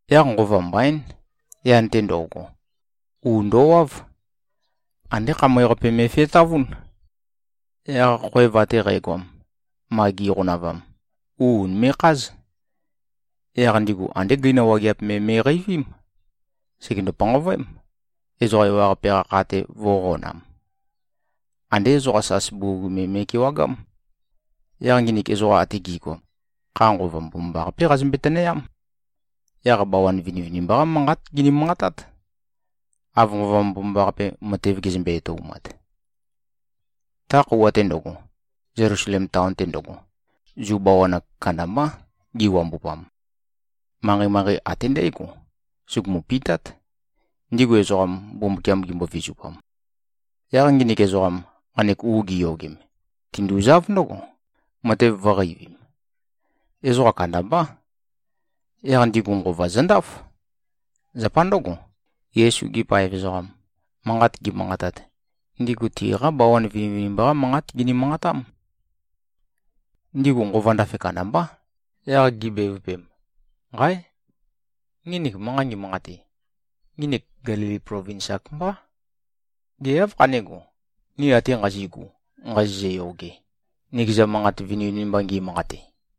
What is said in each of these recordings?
Yaq nqova mbaín, yan-te ndo꞉go, u ndowáv. Andé khamøe-qape me꞉fetavún. Yaq khoev ate qægoam, ma gi꞉qonavam, u ùnime꞉kház. Yaq ndigu andé gøina wageap me me꞉qeivím. Sègendo-panqavøém, ezoqa ewaqape-qa kha-te, vø̄qonam. Andé ezoqa sas bugug me me꞉kewagám. Yaq nginik ezoqam ate gi꞉goam, kha Nqova Mbomambaqapé qazømbe-tønøyám. Yaq bawan vinivinimba-qá manqát gini-manqatát, av Nqova Mbomambaqape, matev gezømbe-etoumat. Ta khøuwa-te ndøgo, Zelusalem taon-te ndøgo, Zu bawan-ak kandambá giwambupam. Manqei-manqei ate ndǽgo, sugumu-pitát, ndigu ezoqam, Mbumbukiam gimbo-vizupam. Yaq nginik ezoqam, nqanek u giyogem, tinduzáv ndǿgo, matev vǿqeivim. Ezoqa kandambá. Yaq ndigu nqova zøndáf. Zapa ndǿgo, Yesu-gi paev ezoqam, manqat gimanqatat, ndigu tiqá bawan vinivinimba-qá manqát gini-manqatám. Ndigu nqova ndafe kandambá, yaq gibevøpem, “Nqáe! Nginik manqa ngimanqate, nginik Gelili plovins-ak mbá. Gê, áv khané꞉go, ni ate nqazi꞉gu nqazizø-yoge, nikeza manqat vinivinimba ngi꞉manqate?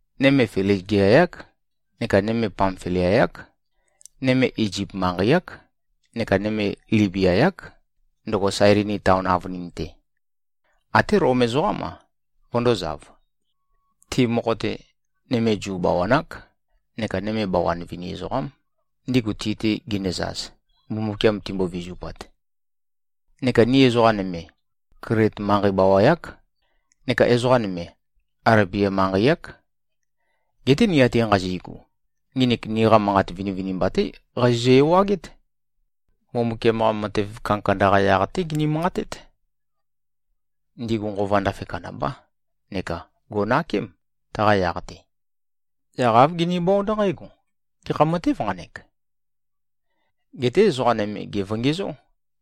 nøme Fligia-yák neka nøme Pamfilia-yák, nøme Izip manqei-ák neka nøme Libia-yák, ndøgo Sailini taon avønin-te. Até Lom ezoqám-a, vøndōzav. Ti mokho-te, nøme Zu bawan-ák neka nøme bawan vini ezoqám, ndigu ti-te ginøzaz, Mbumbukiam timbo-vizupat. Neka ni ezoqa nøme, Klit manqei bawa-yák, neka ezoqa nøme, Alebia manqei-ák. Geté ni ate nqazi꞉gu, nginik niqa manqat vinivinimba-té qazizø-ewagét. Mbumbukiam-qa matev kandakanda-qa yaq-té gini-manqatét.” Ndigu nqova ndafe kandambá neka gò꞉nakém, taqa yaq-te. Yaq āv ginibónd nqǽgo, “Gekha matêv nqanek?” Geté ezoqa nøme gèvongezó,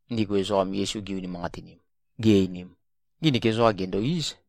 ndigu ezoqam, Yesu gi-unimanqatinim, gi-einim, “Nginik ezoqam, gèndo-íz.”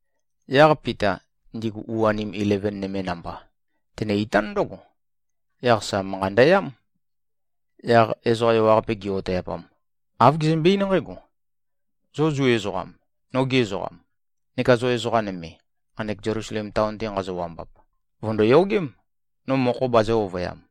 Yaq Pita, ndigu u-anim ileven nøme namba, tenø-itán ndǿgo. Yaq sa manqa ndøyám. Yaq ezoqa ewaqape, gi-oteipam, āv gezømbe-eín nqǽgo, “Zo Zu ezoqam, nogi ezoqam, neka zo ezoqa nøme, nqanek Zelusalem taon-te nqazo-wambap, vø̀ndoyogém, no mokho bazø̄-ovøyam.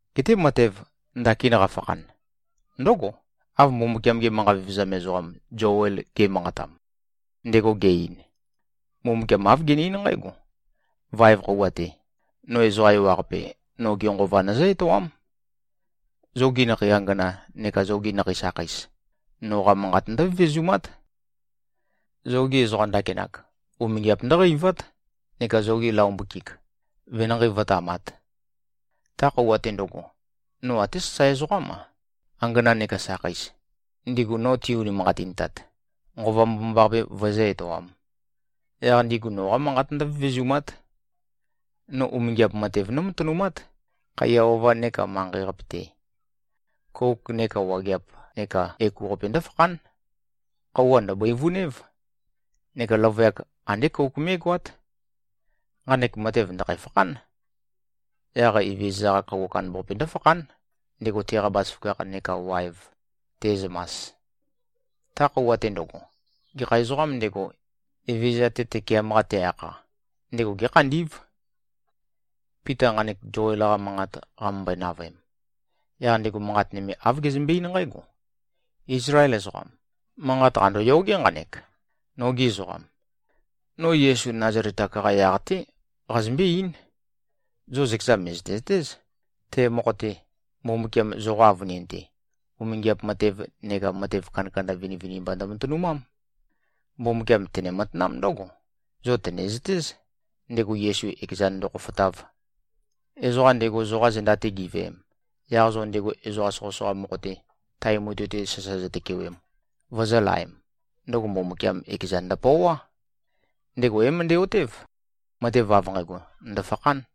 Geté matev, ndakin qafakhan, ndǿgo, av Mbumbukiam-ge manqa vevezam ezoqam Zoel ge꞉manqatam. Ndego ge-ein, ‘Mbumbukiam āv gene-eín nqǽgo, “Vaev khøuwa-te, no ezoqa ewaqape, noge Nqova nøzǿ-etoám. Zogi nakhei angana neka zogi nakhei sakheis, noqa manqat ndǿvevezumát Zogi ezoqa ndakinak, umingiap ndǿqeivát, neka zogi laombøkik, venanqei vǿtamāt. Ta khøuwa-te ndøgo, no até sasae ezoqám-a, angana neka sakheis, ndigu no ti-unimanqatintat, Nqova Mbomambaqape vøezǿ-etoām. Yaq ndigu noqa manqat ndǿvevezumát. No umingiap matev nómatønumát, khaiya ova nekā manqei-qape-te. Kouk neka wageap neka ekuqape ndǿfakhán. Khøuwa ndø̀bøivunév, neka løvøyak andé kouk mé꞉goát. Nqanek matev ndø̀khæ-fakhán. Yaq Evezøza-qa Khøuwa Kandambaqape ndǿfakhán, ndego teqa bazaføgakh neka waev te꞉zømas. Ta khøuwa-te ndøgo, gekha ezoqām ndego, Evezøza-te tøkeam-qa te-akha, ndego gékhandí꞉v.”’” Pita nqanek Zoel-qa manqat qamømbøe-navøem, yaq ndego manqat nøme āv gezømbe-eín nqǽgo, “Ízlael ezoqam! Manqat qàndoyogé nqanek, nogi ezoqam! No Yesu Nazalet-ak-qa yaq-té qazømbé-eín. Zo zøkeza mø̀zøte-zøtéz, te mokho-te, Mbumbukiam zoqa avønin-te, umingiap matev neka matev kandakanda vinivinimba ndømatønumám. Mbumbukiam tene-matanám ndǿgo, zo tø̀nezøtéz, ndego Yesu ekezan ndokhofotáv. Ezoqa ndego zoqa zenda-te giveem, yaq zo ndego ezoqa soqøsoqa mokho-te, tae mutui-te sasa zotøkewem, vozōlaem, ndøgo Mbumbukiam ekezan ndøpøoá. Ndego é-møndæ-otév, matev av nqægo ndø̀fakhán.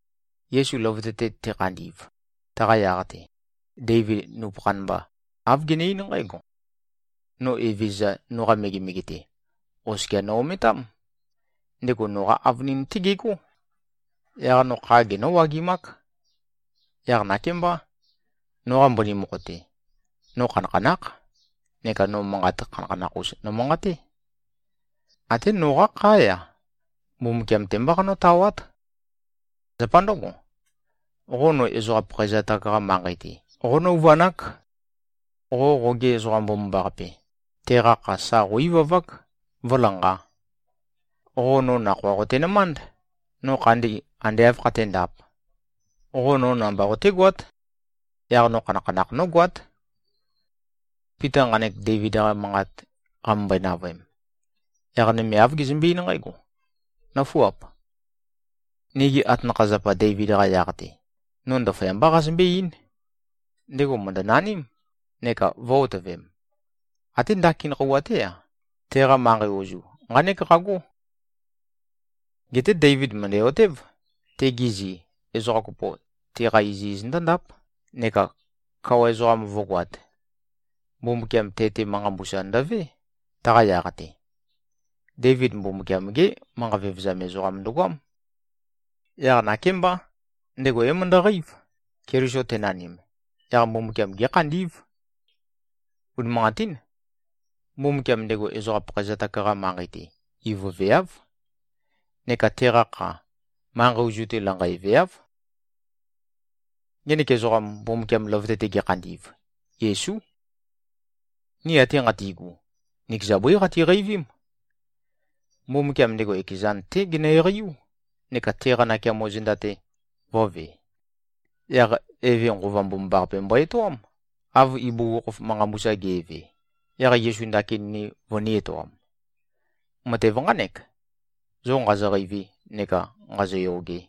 Yesu løvøte-te tekhandi꞉v, taqa yaq-te, Deivid nupøkhan mba, āv gene-eín nqǽgo, ‘No Evezøza, noqa megemege-te, oskia no-ometám. Ndego noqa avønin-té gegó. Yaq no kha genǿ-wagimák. Yaq nakémbá, noqa mbøni mokho-te, no khanakhanákh neka no manqat khanakhanakh-us nomanqaté. Até noqá khá-ya, Mbumbukiam-te mbá qanøtawát. Zapa ndǿgo, qo no ezoqa pakhaezatak-qa manqei-te qónøuvanák. Qo qoge Ezoqam Mbomambaqape, teqa kha, sa qó-ivavák, vǿlanqā. Qo no nakhoa qotenømánd, no khandi ande āv khaténdāp. Qo no namba qotégoát. Yaq no khanakhanakh nógoát.’” Pita nqanek Deivid-qa manqat qamømbøe-navøem, yaq nøme āv gezømbe-eín nqǽgo, “Nǿfuap. Nigi atanakha-zapa Deivid-qa yaq-te, no ndaføyambá qazømbé-eín. Ndego mø̀ndønaním, neka vø̄-otøvem. Até ndakin khøuwa-té-a, teqa manqei ozu nqánek qagó. Geté Deivid mø̀ndæ-otév, tegi zi, ezoqa kopo, teqa iziz ndǿndáp neka kawa ezoqam vǿgoāt. Mbumbukiam te-te manqa mbusa ndøvé, taqa yaq-te. Deivid Mbumbukiam-gé manqa vevezam ezoqam ndøgoám. Yaq nakémbá, ndego é-møndøqeív, Keliso tenanim, yaq Mbumbukiam gékhandí꞉v. Unimanqatín. Mbumbukiam ndego ezoqa pakhaezatak-qa manqei-te ivøveáv, neka teqa kha, manqei ozu-te lanqøeveáv. Ngenek ezoqam, Mbumbukiam løvøte-te gekhandi꞉v, Yesú. Ni ate nqati꞉gu, nikeza bǿi qatiqeivím. Mbumbukiam ndego ekezan-té genø-eqeiú, neka teqa nakeamo zenda-te vø̄ve. Yaq Eve Nqova Mbomambaqape mbo-etoám, av ibugukhokhof manqa mbusa ge꞉ve, yaq Yesu ndakin ni vønī-etoam. Matev nqánek, zo nqazo-qeivi neka nqāzōyōgē.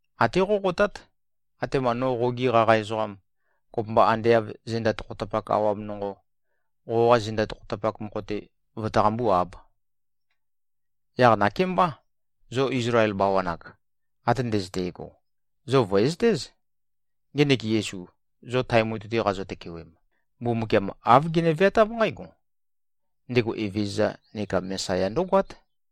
Até qóqotát, atema no qogi qaqa ezoqam, kopømba ande av zenda tokhotapak awam nonqo, qoqa zenda tokhotapak mokho-te vøtaqambú-āb.” ’ Yaq nakémbá, zo Izlael bawan-ak ate ndøzøte꞉go, zo vø̀ezøtéz. Ngenek Yesu, zo tae mutui-te qazo-tøkewem, Mbumbukiam āv gene-veatáv nqǽgo: Ndego Evezøza neka Mesaya ndǿgoát.”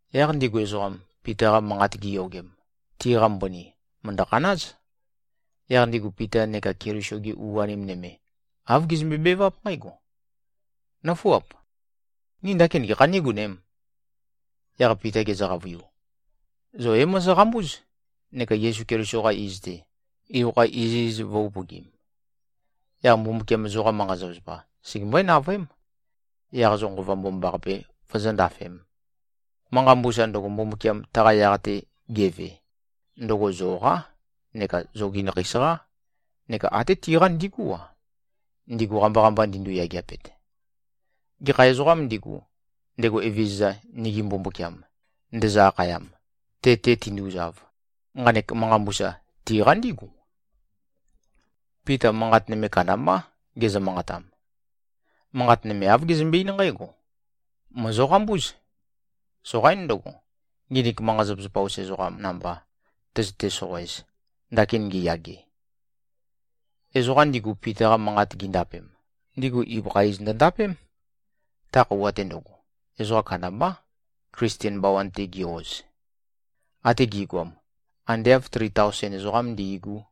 Yaq ndigu ezoqam, Pita-qa manqat giyogem, tiqa mbøni, mø̀ndø-khanáz. Yaq ndigu Pita neka Keliso-gi u-anim nøme, āv gizømbe-beváp nqǽgo, “Nǿfuap. Ni ndakin gekhā nígonēm?” Yaq Pita gezø-qavøiu, “Zo é-mozoqambúz, neka Yesu Keliso-qa iz-te, ibøkha iziz vø̄-upøgim. Yaq Mbumbukiam zoqa manqa-zapazapa, segembøé-navøém, yaq zo Nqova Mbomambaqape vozóndafēm. Manqa mbusa ndøgo, Mbumbukiam taqa yaq-te geve, ndøgo zoqá neka zogi nakheis-qá neka até tiqá ndigú-a, ndigu qamba-qamba ndindu-yageapet. Gekha ezoqām ndigu, ndego Evezøza, nigi Mbumbukiam, ndezø-akhayam, te-te tinduzav, nqanek manqa mbusa tiqa ndígu.” Pita manqat nøme kandambá gezø-manqatam. Manqat nøme, āv gezømbe-eín nqǽgo, “Mòzoqambúz. Soqaín ndøgo, nginik manqa-zapazapa-us ezoqa namba tøzøte-soqoez, ndakin ngiyage.” Ezoqa ndigu, Pita-qa manqat gindapem, ndigu ibøkha iz ndøndapém. Ta khøuwa-te ndøgo, ezoqa kandambá, Klisten bawan-te gi-oz. Ate gi꞉goam, ande āv tri taosen ezoqám ndi꞉gú.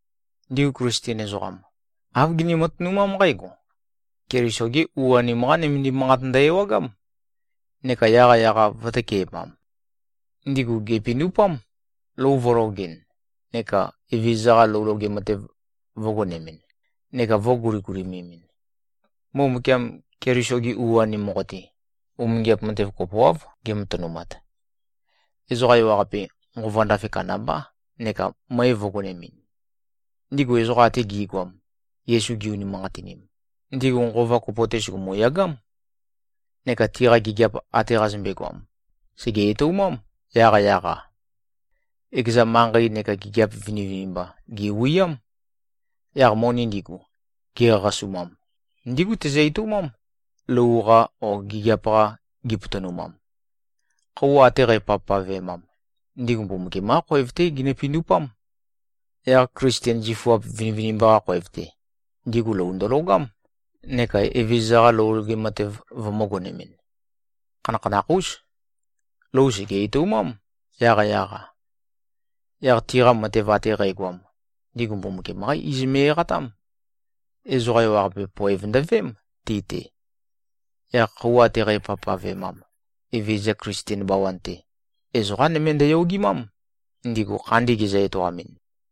Ndigu Klisten ezoqam, āv gini-matønumám nqǽgo: Keliso-gi u-anim-qá nømendim manqat ndø-ewagám, neka yaqyaq-a vø̄tøke꞉mam. Ndigu gèpindupám, lou vø̄logɨn neka Evezøza-qa lou loge matev vø̄gonemɨn neka vø̄guligulimemin. Mbumbukiam, Keliso-gi u-anim mokho-te, umingiap matev kopoáv gematønumat. Ezoqa ewaqape, nqova ndafe kandambá neka møe vø̄gonemɨn. Ndigu ezoqa ate gi꞉goam, Yesu gi-unimanqatinim, ndigu nqova kopo-te sùgumu-yagám. Neka tiqa gigiap ate qazømbe-goam, sège-etoumám, yaqyaq-a. Ekeza manqei neka gigiap vinivinimba gèwiám. Yaq moni ndigu, gi꞉qaqasumam, ndígu tizø-etoumám, lou-qa o gigiap-qa gi꞉potonumam. Khøuwa ate qæpavpavemam, ndigu Mbumbukiam-qá khoev-té ginø-pindupám. Yaq Klisten zifuap vinivinimba-qa khoev-te, ndigu lou ndølogám neka Evezøza-qa lou loge matev vømø̄-gonemɨn. Khanakhanakh-ús. Lou sège-etoumám, yaqyaq-a. Yaq tiqa matev ate qægoam, ndigu Mbumbukiam-qá iz me꞉-eqatám. Ezoqa ewaqape, poev ndøveém, ti-te. Yaq khøuwa ate qæpavpavemam, Evezøza Klisten bawan-te, ezoqá nøme ndøyogimám, ndigu khandi gezø-etoamɨn.